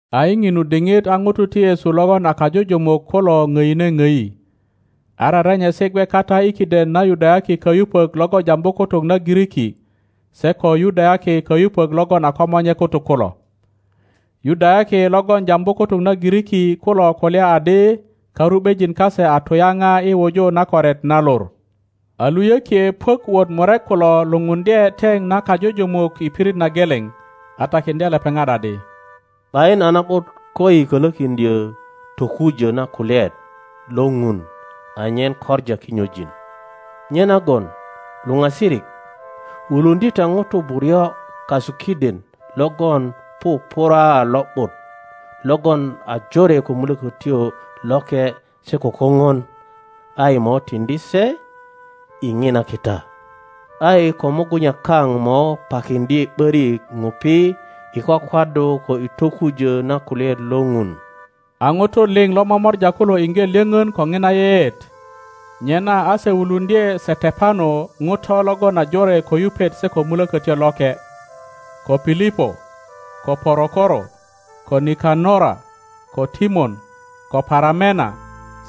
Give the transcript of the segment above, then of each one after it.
A i ŋinu diŋit a ŋutu ti Yesu logon a kajujumuk kulo ŋdine ŋdi, a rerenyesi gwe kata i kiden na Yudayaki kayupök logon jambu kutuk na Giriki se ko Yudayaki kayupök logon a komonye kutuk kulo. Yudayaki logon jambu kutuk na Giriki kulo kulya adi karu ’bejin kase a tuyapa i wuju na koret na lor. a luyökie puök wot murek kulo lupundye teŋ na kajujumuk i pirit na geleŋ, a takiŋdye lepeŋat adi, ’Bayin a na ’but koyi kölökiŋdyö tokujö na kulyaet lo Ŋun anyen koŋa kinyojin. Nyenagon luŋa sirik, wuluŋdye ta ŋutu buryo kasu kiden logon pupura a lo ’but, logon a jore ko Mulökötyo Loke se ko kopon, a yi mo tiŋdi se i ŋina kita. A yi ko mugunya kaŋ mo pakiŋdye ’börik ŋupi i kwakwaddu ko i tokujö na kulyaet lo Ŋun. A ŋutu liŋ lo momora kulo iŋge lyoŋon ko ŋina yeyeet, nyena a se wuluŋdye Setepano ŋuto logon a jore ko yupet se ko Mulokotyo Loke, ko Pilipo, ko Porokoro, ko Nikanora, ko Timon, ko Paramena,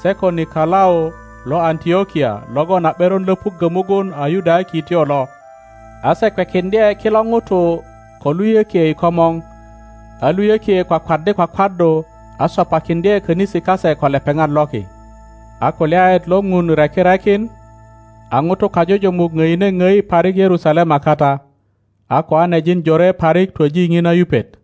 se ko Nikolau lo Antlokia logon a ’beron löpuggö mugun a Yudayakityo lo. A se kwekiŋdye kilo ŋutu ko luyökie i komor, a luyökie kwakwaddi kwakwaddu a sopakiŋdye könisi kase ko lepeŋat loki. A kulyaet lo Ŋun reki rekin, a ŋutu kajujumuk ŋdine ŋdi parik Yerusalema kata, a koanejin jore parik twoji ŋina yupet.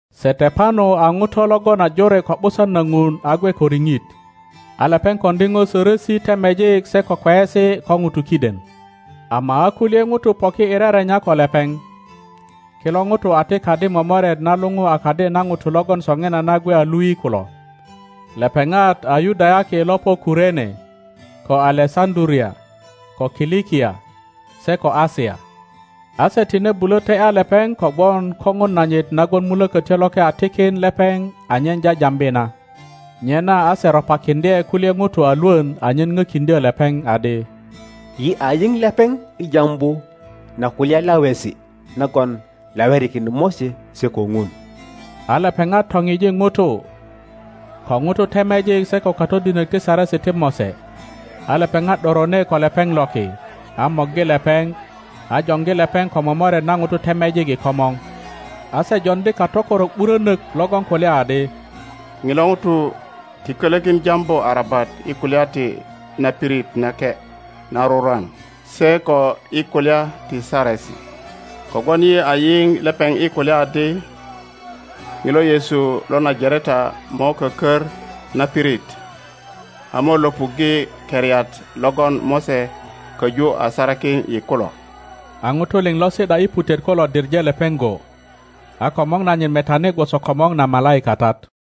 Setepano a ŋuto logon a jore ko ’busan na Ŋun a gwe ko riŋit, a lepeŋ koŋdi po sörösi temejik se ko kweyesi ko ŋutu kiden. Ama a kulye ŋutu poki i rerenya ko lepeŋ. Kilo ŋutu a ti kadi momoret na luŋu a kadi na ŋutu logon soŋinana gwe a lui kulo. Lepeŋat a Yudayaki lo po Kurene, ko Alesaŋduria, ko Kilikia, se ko Asia. A se tine bulö te ’ya lepeŋ kogwon kopon nanyit nagon Mulökötyo Loke a tikin lepeŋ anyen jajambi na. Nyena a se ropakiŋdye kulye ŋutu a lwön anyen pökiŋdyö lepeŋ adi, Yi a yiŋ lepeŋ i jambu na kulya lawesi nagon lawerikin Mose se ko Ŋun. A lepeŋat topiji ŋutu, ko ŋutu temejik se ko katodinök ti Saresi ti Mose, a lepeŋat ’dorone ko lepeŋ loki, a morgi lepeŋ, a joŋgi lepeŋ ko momoret na ŋutu temejik i komor, a se joŋdi katökorok ’burönök logon kulya adi, ŋilo ŋuto ti kölökin jambu arabat i kulya ti na pirit nake na rurwan se ko i kulya ti Saresi, kogwon yi a yiŋ lepeŋ i kulya adi, ŋilo Yesu lo Najareta mo kökör na pirit, a mo löpuŋge keriat logon Mose köju a sarakin yi kulo. A ŋutu liŋ lo si ’da i putet kulo diŋe lepeŋ go, a komor nanyit metani gwoso komor na malaikatat.